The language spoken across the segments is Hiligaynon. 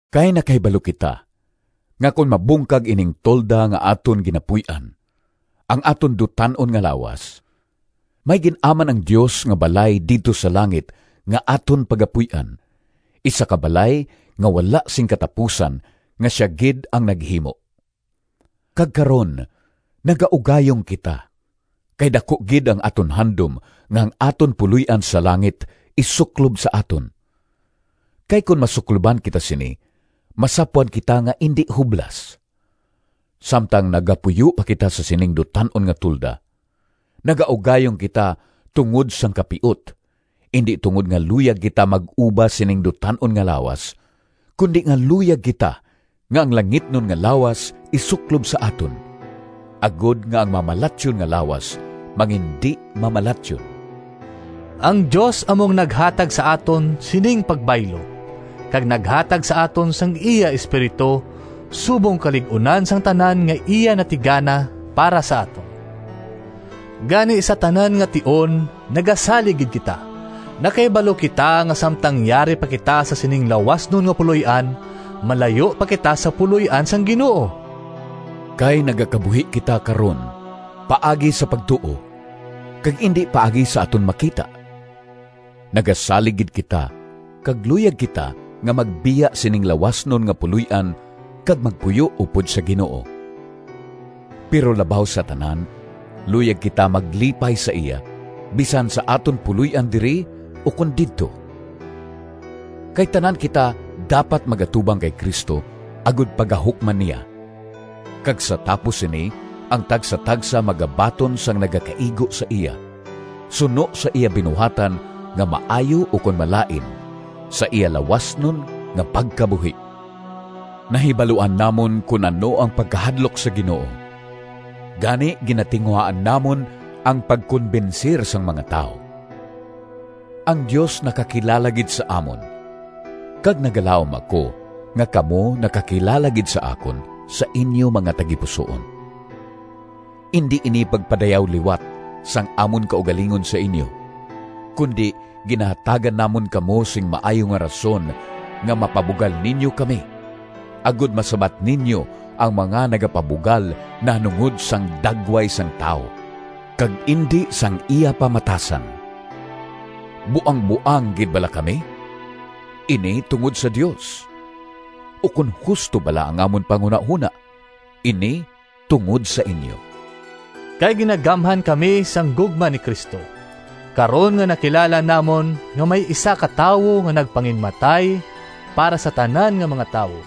Kay nakahibalo kita nga kon mabungkag ining tolda nga aton ginapuy-an—ang aton dutan-on nga lawas—may gin-aman ang Dios nga balay didto sa langit nga aton pagapuy-an, isa ka balay nga wala sing katapusan nga sia gid ang naghimo. Kag karon nagaugayong kita, kay daku gid ang aton handom nga ang aton puloy-an sa langit isuklob sa aton, kay kon masukloban kita sini masapwan kita nga indi hublas. Samtang nagapuyo pa kita sa sining dutan-on nga tolda, nagaugayong kita tungod sang kapiut, indi tungod nga luyag kita mag-uba sining dutan-on nga lawas, kundi nga luyag kita nga ang langitnon nga lawas isuklob sa aton, agod nga ang mamalatyon nga lawas mangindi-mamalatyon. Ang Dios amo ang naghanda sa aton sining pagbaylo, kag naghatag sa aton sang iya Espiritu subong kalig-unan sang tanan nga iya natigana para sa aton. Gani, sa tanan nga tion nagasalig gid kita. Nakahibalo kita nga samtang yari pa kita sa sining lawasnon nga puloy-an malayo pa kita sa puloy-an sang Ginoo. Kay nagakabuhi kita karon paagi sa pagtuo, kag indi paagi sa aton makita. Nagasalig gid kita, kag luyag kita nga magbiya sining lawasnon nga puloy-an kag magpuyo upod sa Ginoo. Pero labaw sa tanan, luyag kita maglipay sa iya, bisan sa aton puloy-an diri ukon didto. Kay tanan kita dapat mag-atubang kay Cristo, agod pagahukman niya, kag sa tapos sini ang tagsatagsa magabaton sang nagakaigo sa iya, suno sa iya binuhatan nga maayo ukon malain, sa iya lawasnon nga pagkabuhi. Nahibaluan namon kon ano ang pagkahadlok sa Ginoo, gani ginatinguhaan namon ang pagkonbensir sang mga tawo. Ang Dios nakakilala gid sa amon kag nagalaom ako nga kamo nakakilala gid sa akon sa inyo mga tagipusoon. Indi ini pagpadayaw liwat sang amon kaugalingon sa inyo, kundi ginahatagan namon kamo sing maayo nga rason nga mapabugal ninyo kami, agod masabat ninyo ang mga nagapabugal nahanungod sang dagway sang tawo, kag indi sang iya pamatasan. Buangboang gid bala kami? Ini tungod sa Dios. Ukon husto bala ang amon panghunahona? Ini tungod sa inyo. Kay ginagamhan kami sang gugma ni Cristo, karon nga nakilala namon nga may isa ka tawo nga nagpanginmatay para sa tanan nga mga tawo,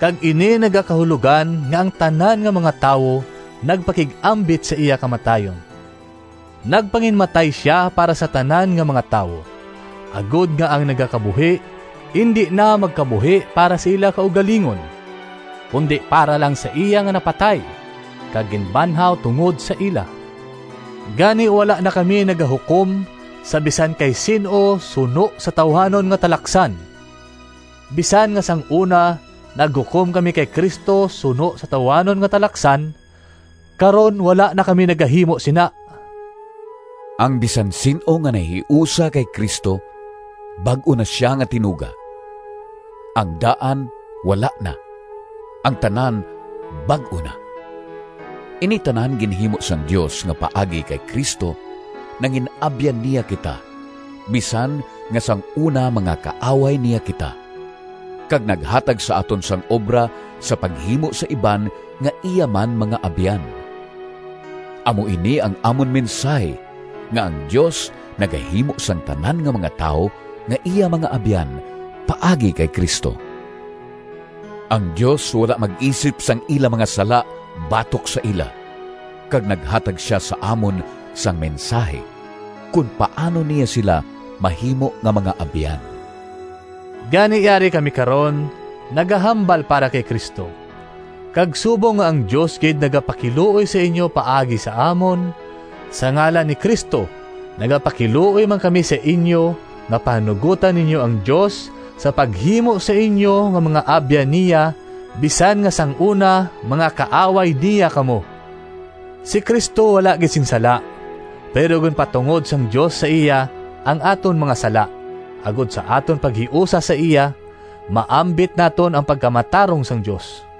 kag ini nagakahulogan nga ang tanan nga mga tawo nagpakig-ambit sa iya kamatayon. Nagpanginmatay sia para sa tanan nga mga tawo, agod nga ang nagakabuhi indi na magkabuhi para sa ila kaugalingon, kundi para lang sa iya nga napatay kag ginbanhaw tungod sa ila. Gani, wala na kami nagahukom sa bisan kay sin-o suno sa tawuhanon nga talaksan. Bisan nga sang una naghukom kami kay Cristo suno sa tawuhanon nga talaksan, karon wala na kami nagahimo sina. Ang bisan sin-o nga nahiusa kay Cristo bag-o na sia nga tinuga—ang daan wala na, ang tanan bag-o na. Ini tanan ginhimo sang Dios, nga paagi kay Cristo nangin-abyan niya kita bisan nga sang una mga kaaway niya kita, kag naghatag sa aton sang obra sa paghimo sa iban nga iya man mga abyan. Amo ini ang amon mensahi nga ang Dios nagahimo sang tanan nga mga tawo nga iya mga abyan paagi kay Cristo. Ang Dios wala mag-isip sang ila mga sala batok sa ila, kag naghatag sia sa amon sang mensahi kon paano niya sila mahimo nga mga abyan. Gani, yari kami karon nagahambal para kay Cristo. Kag subong nga ang Dios gid nagapakiluoy sa inyo paagi sa amon, sa ngalan ni Cristo, nagapakiluoy man kami sa inyo nga pahanugotan ninyo ang Dios sa paghimo sa inyo nga mga abyan niya bisan nga sang una mga kaaway niya kamo! Si Cristo wala gid sing sala, pero ginpatungod sang Dios sa iya ang aton mga sala, agod sa aton paghiusa sa iya, maambit naton ang pagkamatarong sang Dios.